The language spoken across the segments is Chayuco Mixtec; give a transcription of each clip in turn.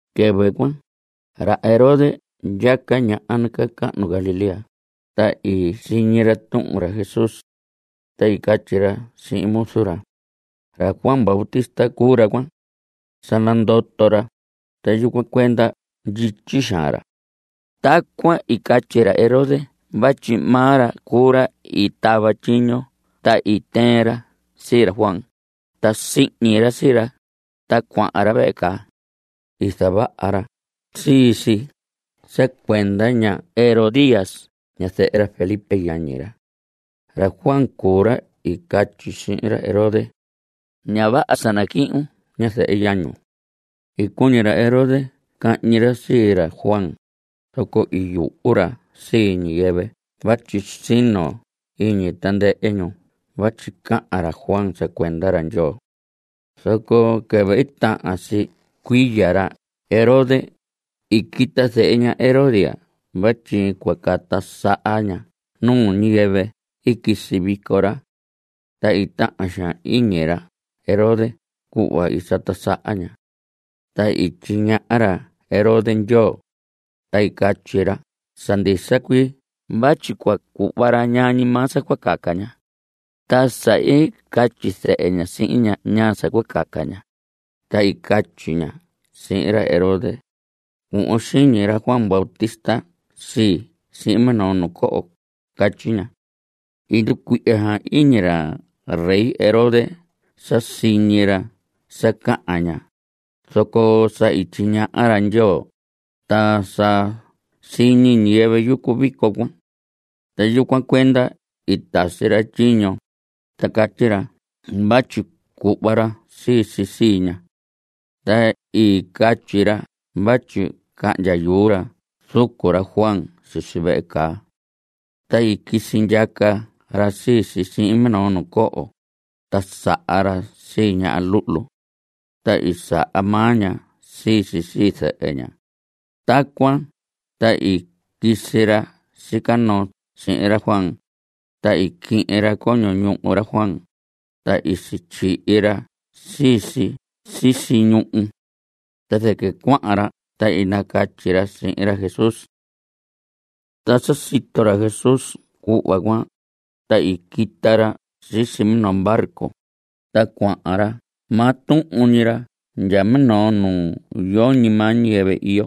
Quɨvɨ cuan, ra Herodes ndyaca ñaha nacahnu Galilea, ta i siñi ra tuhun ra Jesús. Ta i catyi ra sihin muzu ra: Ra Juan Bautista cuu ra cuan. Sa nandoto ra, ta yucuan cuenda ndyityi xaan ra. Tacuan i catyi ra Herodes vatyi maa ra cuu ra i tava tyiño ta i tɨɨn ra sii ra Juan, ta sihñi ra sii ra, ta cuahan ra vehe caa. I zavaha ra sii si sa cuenda ña Herodías, ñazɨhɨ ra Felipe yañi ra. Ra Juan cuu ra i catyi sihin ra Herodes: Ña vaha sa nacuhun ñazɨhɨ yañun. I cuñi ra Herodes cahñi ra sii ra Juan, zoco i yuhu ra sii ñiyɨvɨ vatyi sino iñi tandɨhɨ ñu vatyi cahan ra Juan sa cuenda ra Ndyoo. Zoco quɨvɨ tahan si cuiya ra Herodes, i quita zehe ña Herodías vatyi cua cata saha ña nuu ñiyɨvɨ i quisi vico ra. Ta i tahan xaan iñi ra Herodes cuhva i sata saha ña. Ta i tyiñaha ra Herodes Ndyoo, ta i catyi ra sa ndisa cuii vatyi cua cuhva ra ñaa ñi maa sa cua caca ña. Ta sa i nacatyi zɨhɨ ña sihin ña ñaa sa cua caca ña, ta i catyi ña sihin ra Herodes: Cuhvon xiñi ra Juan Bautista sii sihin minoo nu coho. Catyi ña. I nducuihya xaan iñi ra rey Herodes sa siñi ra sa cahan ña, zoco sa tyiñaha ra Ndyoo, ta sa siñi ñiyɨvɨ yucu vico cuan. Ta yucuan cuenda i tasi ra tyiño, ta catyi ra vatyi cuhva ra sii si sii ña. Ta i catyi ra vatyi cahndya yuu ra zucu ra Juan sisi vehe caa. Ta i quisi ndyaca ra sii si sihin minoo nu coho, ta saha ra sii ña luhlu. Ta i saha maa ña sii si sii zɨhɨ ña. Tacuan ta i quisi ra sica noo sihin ra Juan, ta i quihin ra coño ñuhu ra Juan, ta i sityihi ra sii si sisi ñuhu. Ta zɨquɨ cuahan ra ta i nacatyi ra sihin ra Jesús. Ta sa sito ra Jesús cuhva cuan, ta i quita ra sisi minoo barco, ta cuahan ra maa tuhun ñi ra ndya minoo nu yoñi maa ñiyɨvɨ iyo.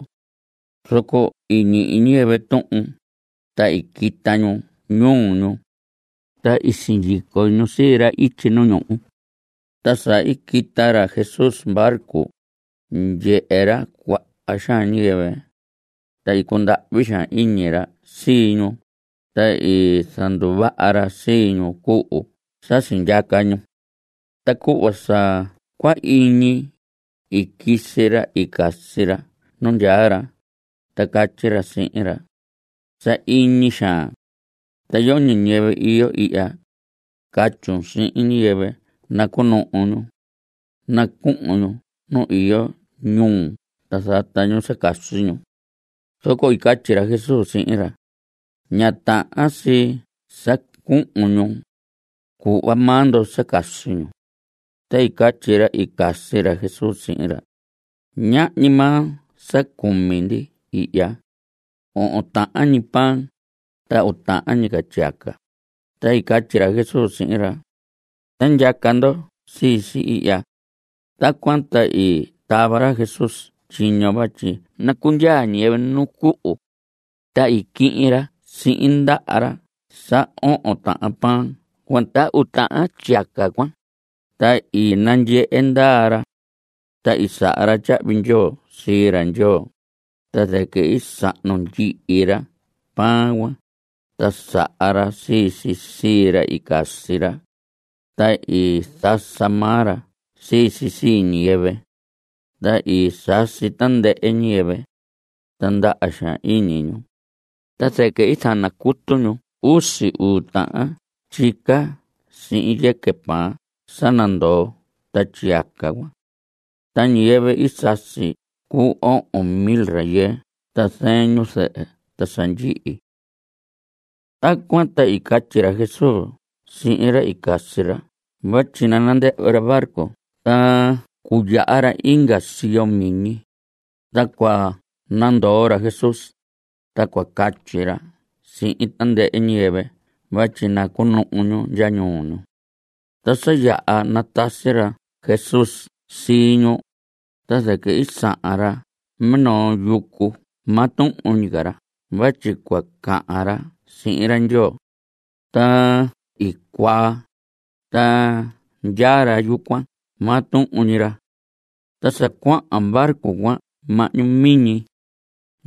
Zoco i ñihi ñiyɨvɨ tuhun, ta i quita ñu ñuu ñu, ta i sindyico ñu sii ra ityi nu ñuhu. Ta sa i quita ra Jesús barco, i ndyehe ra cuaha xaan ñiyɨvɨ. Ta i cundahvi xaan iñi ra sii ñu, ta i zanduvaha ra sii ñu cuhu sa sindyaca ñu. Ta cuhva sa cua iñi, i quisi ra i casi ra nu ndyaa ra, ta catyi ra sihin ra: Sahiñi xaan. Ta yoñi ñiyɨvɨ iyo ihya. Catyun sihin ñiyɨvɨ nacuhun ñu. Nacuhun ñu nu iyo ñuu ta zata ñu sa casi ñu. Zoco i catyi ra Jesús sihin ra: Ña tahan si sa cuhun ñu. Cuhva maa ndo sa casi ñu. Ta i catyi ra i casi ra Jesús sihin ra: Ñahñi maa sa cumi ndi ihya. Ohon tahan ñi pan, ta uu tahan ñi tyiyaca. Ta i catyi ra Jesús sihin ra: Ta ndyaca ndo sii si ihya. Tacuan ta i tava ra Jesús tyiño vatyi nacundyaa ñiyɨvɨ nu cuhu. Ta i quihin ra sihin ndaha ra sa ohon tahan pan cuan ta uu tahan tyiyaca cuan, ta i nandyehe ndaa ra. Ta i saha ra tyahvi ndyoo sii ra Ndyoo, ta zɨquɨ i sahnu ndyihi ra pan cuan, ta saha ra sii si sii ra i casi ra. Ta i zasa maa ra sii si sii ñiyɨvɨ. Ta i sasi tandɨhɨ ñiyɨvɨ. Ta ndaha xaan iñi ñu. Ta zɨquɨ i zanacutu ñu usi uu tahan tyica sihin yɨquɨ pan sa nandoo ta tyiyaca cuan. Ta ñiyɨvɨ i sasi i cuu ohon mil rayɨɨ ta zɨɨn ñu zɨhɨ ta sa ndyihi. Tacuan ta i catyi ra Jesús sihin ra i casi ra vatyi nandɨhvɨ ra barco ta cuyaha ra inga siyo miñi. Ta cua nandoo ra Jesús, ta cua catyi ra sihin tandɨhɨ ñiyɨvɨ vatyi cunuhu ñu ndya ñuu ñu. Ta sa yaha natasi ra Jesús sii ñu, ta zɨquɨ i sahan ra minoo yucu maa tuhun ñi ra vatyi cua cahan ra sihin ra Ndyoo. Ta i cuaa, ta ndyaa ra yucuan maa tuhun ñi ra. Ta sa cuahan barco cuan mahñu miñi.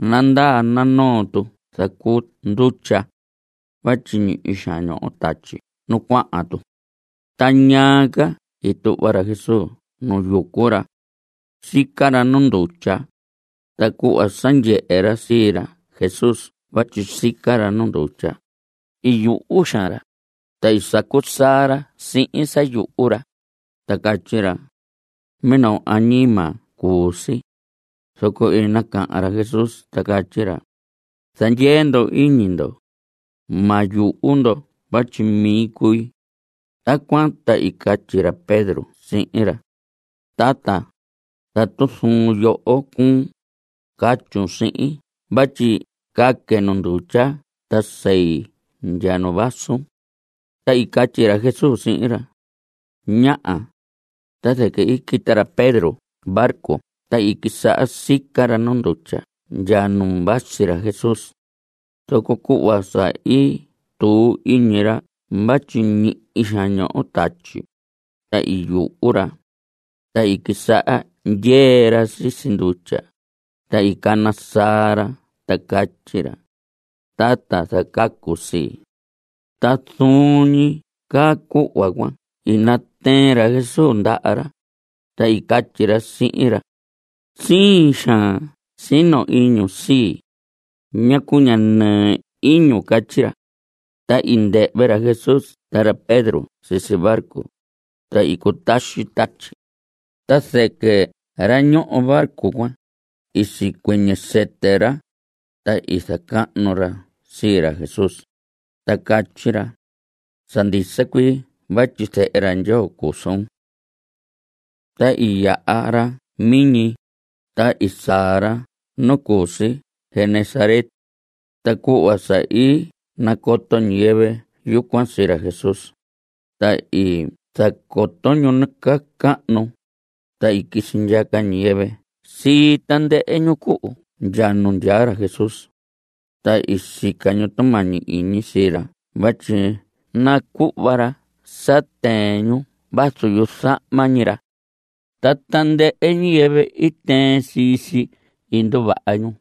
Nandaa, nanoo tu zacuu ndutya vatyi ñihi xaan ñoho tatyi nu cuahan tu. Ta ñaa ca i tuhva ra Jesús nu yucu ra. Sica ra nu ndutya. Ta cuhva sa ndyehe ra sii ra Jesús vatyi sica ra nu ndutya, i yuhu xaan ra, ta i sacu saa ra sihin sa yuhu ra, ta catyi ra: ¡Minoo añima cuu si! Zoco i cahan ra Jesús, ta catyi ra: Zandyee ndo iñi ndo. Ma yuhu ndo vatyi mi cui. Tacuan ta i catyi ra Pedro sihin ra: Tata, tatu zuun yoho cuu, catyun sihin vatyi caque nu ndutya ta sei ndya nu vasun. Ta i catyi ra Jesús sihin ra: Ñaha. Ta zɨquɨ i quita ra Pedro barco ta i quisaha sica ra nu ndutya ndya nu vasi ra Jesús. Zoco cuhva sa i tuu iñi ra vatyi ñihi xaan ñoho tatyi, ta i yuhu ra. Ta i quisaha ndyee ra sisi ndutya, ta i cana saa ra, ta catyi ra: ¡Tata, zacacun sii! Ta zuun ñi caa cuhva cuan i natɨɨn ra Jesús ndaha ra, ta i catyi ra sihin ra: ¡Siin xaan sino iñun sii! ¿Ñacu ña nɨɨ iñun? Catyi ra. Ta i ndɨhvɨ ra Jesús ta ra Pedro sisi barco, ta i cutaxi tatyi. Ta zɨquɨ ra ñoho barco cuan, i sicuɨñɨ sɨtɨ ra, ta i zacahnu ra sii ra Jesús, ta catyi ra: Sa ndisa cuii vatyi Zehe ra Ndyoo cuu suun. Ta i yaha ra miñi, ta i saa ra nu cu si Genesaret. Ta cuhva sa i nacoto ñiyɨvɨ yucuan sii ra Jesús, ta i zacoto ñu nacaa cahnu, ta i quisi ndyaca ñiyɨvɨ sii tandɨhɨ ñu cuhu ndya nu ndyaa ra Jesús. Ta i sica ñu tumañi iñi sii ra vatyi nacuhva ra sa tɨɨn ñu vazu yuzahma ñi ra. Ta tandɨhɨ ñiyɨvɨ i tɨɨn sii si, i nduvaha ñu.